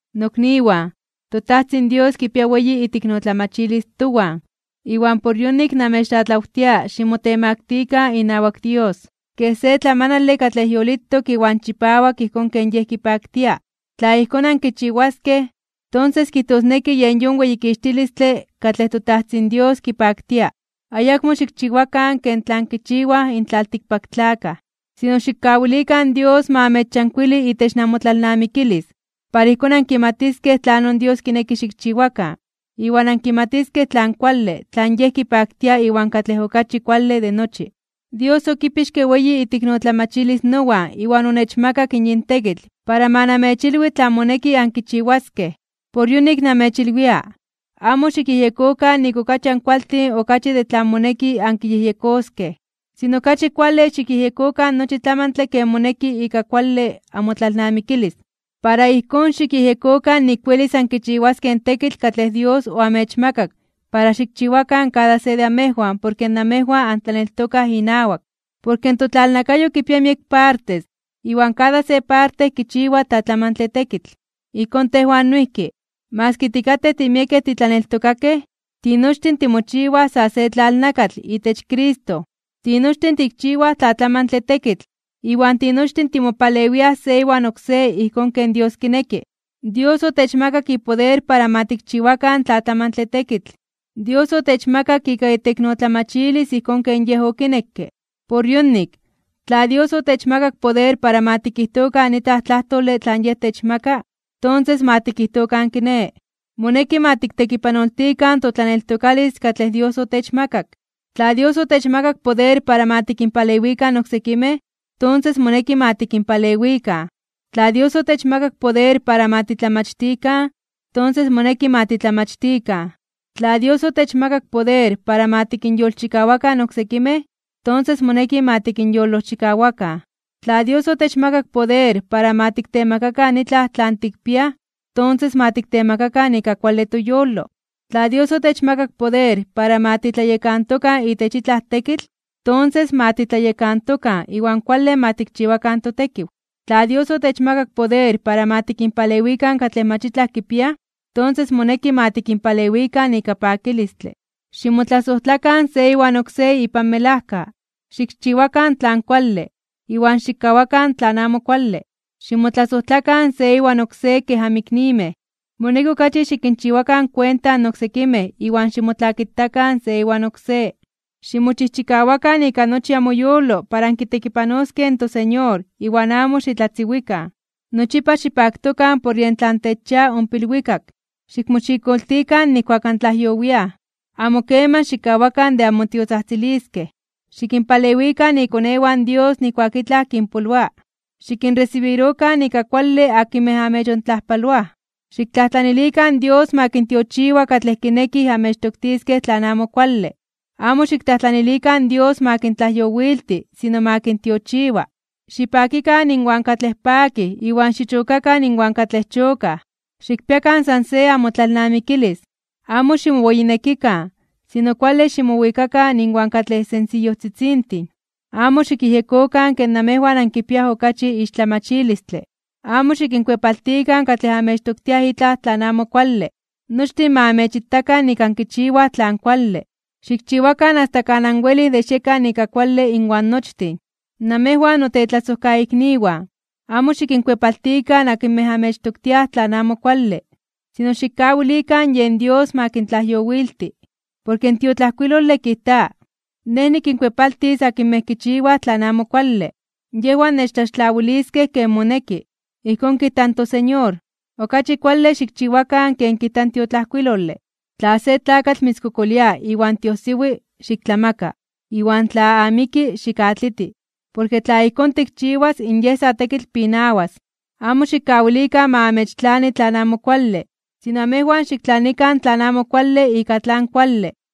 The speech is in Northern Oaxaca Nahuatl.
Nokniwan, toTajtzin Dios kipia weyi iteiknotlamachilis towan. Iwan por yonik namechtlatlawtia ximotemaktikan (ximotemaktilikan) inawak Dios kej se tlamanale katlej yolitok iwan chipawak ijkón ken Yej kipaktia. Tla ijkón ankichiwaskej, tonses kijtosneki yen yon weyikixtilistle katlej toTajtzin Dios kipaktia. Ayakmo xikchiwakan ken tlan kichiwaj in tlaltikpaktlakaj. Sino xikkawilikan in Dios ma amechyankuili itech namotlalnamikilis, para ijkón ankimatiskej tlanon Dios kineki xikchiwakan, iwan ankimatiskej tlan kuale, tlan Yej kipaktia iwan katlej okachi kuale de nochi. Dios okipixke weyi iteiknotlamachilis nowan iwan onechmakak yin tekitl para ma namechilwi tlan moneki ankichiwaskej. Por yonik namechilwia, amo xikyejyekokan nik okachi ankualtin okachi de tlan moneki ankiyejyekoskej. Sino okachi kuale xikyejyekokan nochi tlamantle ken moneki ika kuale amotlalnamikilis. Para ijkón xikyejyekokan nik welis ankichiwaskej in tekitl katlej Dios oamechmakak para xikchiwakan kada se de amejwan porke namejwan antlaneltokaj inawak. Porke in totlalnakayo kipia miek partes, iwan kada se parte kichiwa tlatlamantle tekitl. Ijkón tejwan noijki, maski tikatej timiekej titlaneltokakej, tinochtin timochiwaj sa se tlalnakatl itech Cristo. Tinochtin tikchiwaj tlatlamantle tekitl, iwan tinochtin timopalewiaj se iwan oksé ijkón ken Dios kineki. Dios otechmakak ipoder para ma tikchiwakan tlatlamantle tekitl. Dios otechmakak ika iteiknotlamachilis ijkón ken Yej okinekke. Por yonik, tla Dios otechmakak poder para ma tikijtokan itlaj tlajtole tlan Yej techmaka, tonses ma tikijtokan kiné. Moneki ma tiktekipanoltikan totlaneltokalis katlej Dios otechmakak. Tla Dios otechmakak poder para ma tikinpalewikan oksekimej, tonses moneki ma tikinpalewikan. Tla Dios otechmakak poder para ma titlamachtikan, tonses moneki ma titlamachtikan. Tla Dios otechmakak poder para ma tikinyolojchikawakan oksekimej, tonses moneki ma tikinyolojchikawakan. Tla Dios otechmakak poder para ma tiktemakakan itlaj tlan tikpiaj, tonses ma tiktemakakan ika kuale toyolo. Tla Dios otechmakak poder para ma titlayekantokan itech itlaj tekitl, tonses ma titlayekantokan iwan kuale ma tikchiwakan totekiw. Tla Dios otechmakak poder para ma tikinpalewikan katlej mach itlaj kipiaj, tonses moneki ma tikinpalewikan ika pakilistle. Ximotlasojtlakan se iwan oksé ipan melajka. Xikchiwakan tlan kuale, iwan xikkawakan tlan amo kuale. Ximotlasojtlakan se iwan oksé kej anmiknimej. Moneki okachi xikinchiwakan kuenta in oksekimej iwan ximotlakitakan se iwan oksé. Ximochijchikawakan ika nochi amoyolo para ankitekipanoskej in toSeñor iwan amo xitlatziwikan. Nochipa xipaktokan por yen tlan techchia ompa ilwikak. Xikmoxikoltikan nijkuak antlajyowiaj. Amo keman xikkawakan de anmotiotzajtziliskej. Xikinpalewikan ikonewan Dios nijkuak itlaj kinpoloa. Xikinresibirokan ika kuale akinmej amechontlajpaloaj. Xiktlajtlanilikan Dios ma kintiochiwa katlej kinekij amechtoktiskej tlan amo kuale. Amo xiktlajtlanilikan Dios ma kintlajyowilti, sino ma kintiochiwa. Xipakikan inwan katlej pakij, iwan xichokakan inwan katlej chokaj. Xikpiakan san se amotlalnamikilis. Amo ximoweyinekikan, sino kuale ximowikakan inwan katlej sensiyojtzitzintin. Amo xikyejyekokan ke namejwan ankipiaj okachi ixtlamachilistle. Amo xikinkuepaltikan katlej amechtoktiaj itlaj amo kuale. Nochtin ma amechitakan nik ankichiwaj tlan kuale. Xikchiwakan asta kan anwelij de xiekan ika kuale inwan nochtin. Namejwan notetlasojkaikniwan, amo xikinkuepaltikan akinmej amechtoktiaj tlan amo kuale, sino xikkawilikan yen Dios ma kintlajyowilti. Porke in tiotlajkuilole kijta: “Nej nikinkuepaltis akinmej kichiwaj tlan amo kuale, yejwan nechtlaxtlawiliskej ken moneki.” Ijkón kijta in toSeñor. Okachi kuale xikchiwakan ken kijta in tiotlajkuilole: “Tla se tlakatl mitzkokolia iwan tiojsiwi, xiktlamaka, iwan tla amiki xikatliti. Porke tla ijkón tikchiwas, in yej sa tekitl pinawas.” Amo xikkawilikan ma amechtlani tlan amo kuale, sino amejwan xiktlanikan tlan amo kuale ika tlan kuale.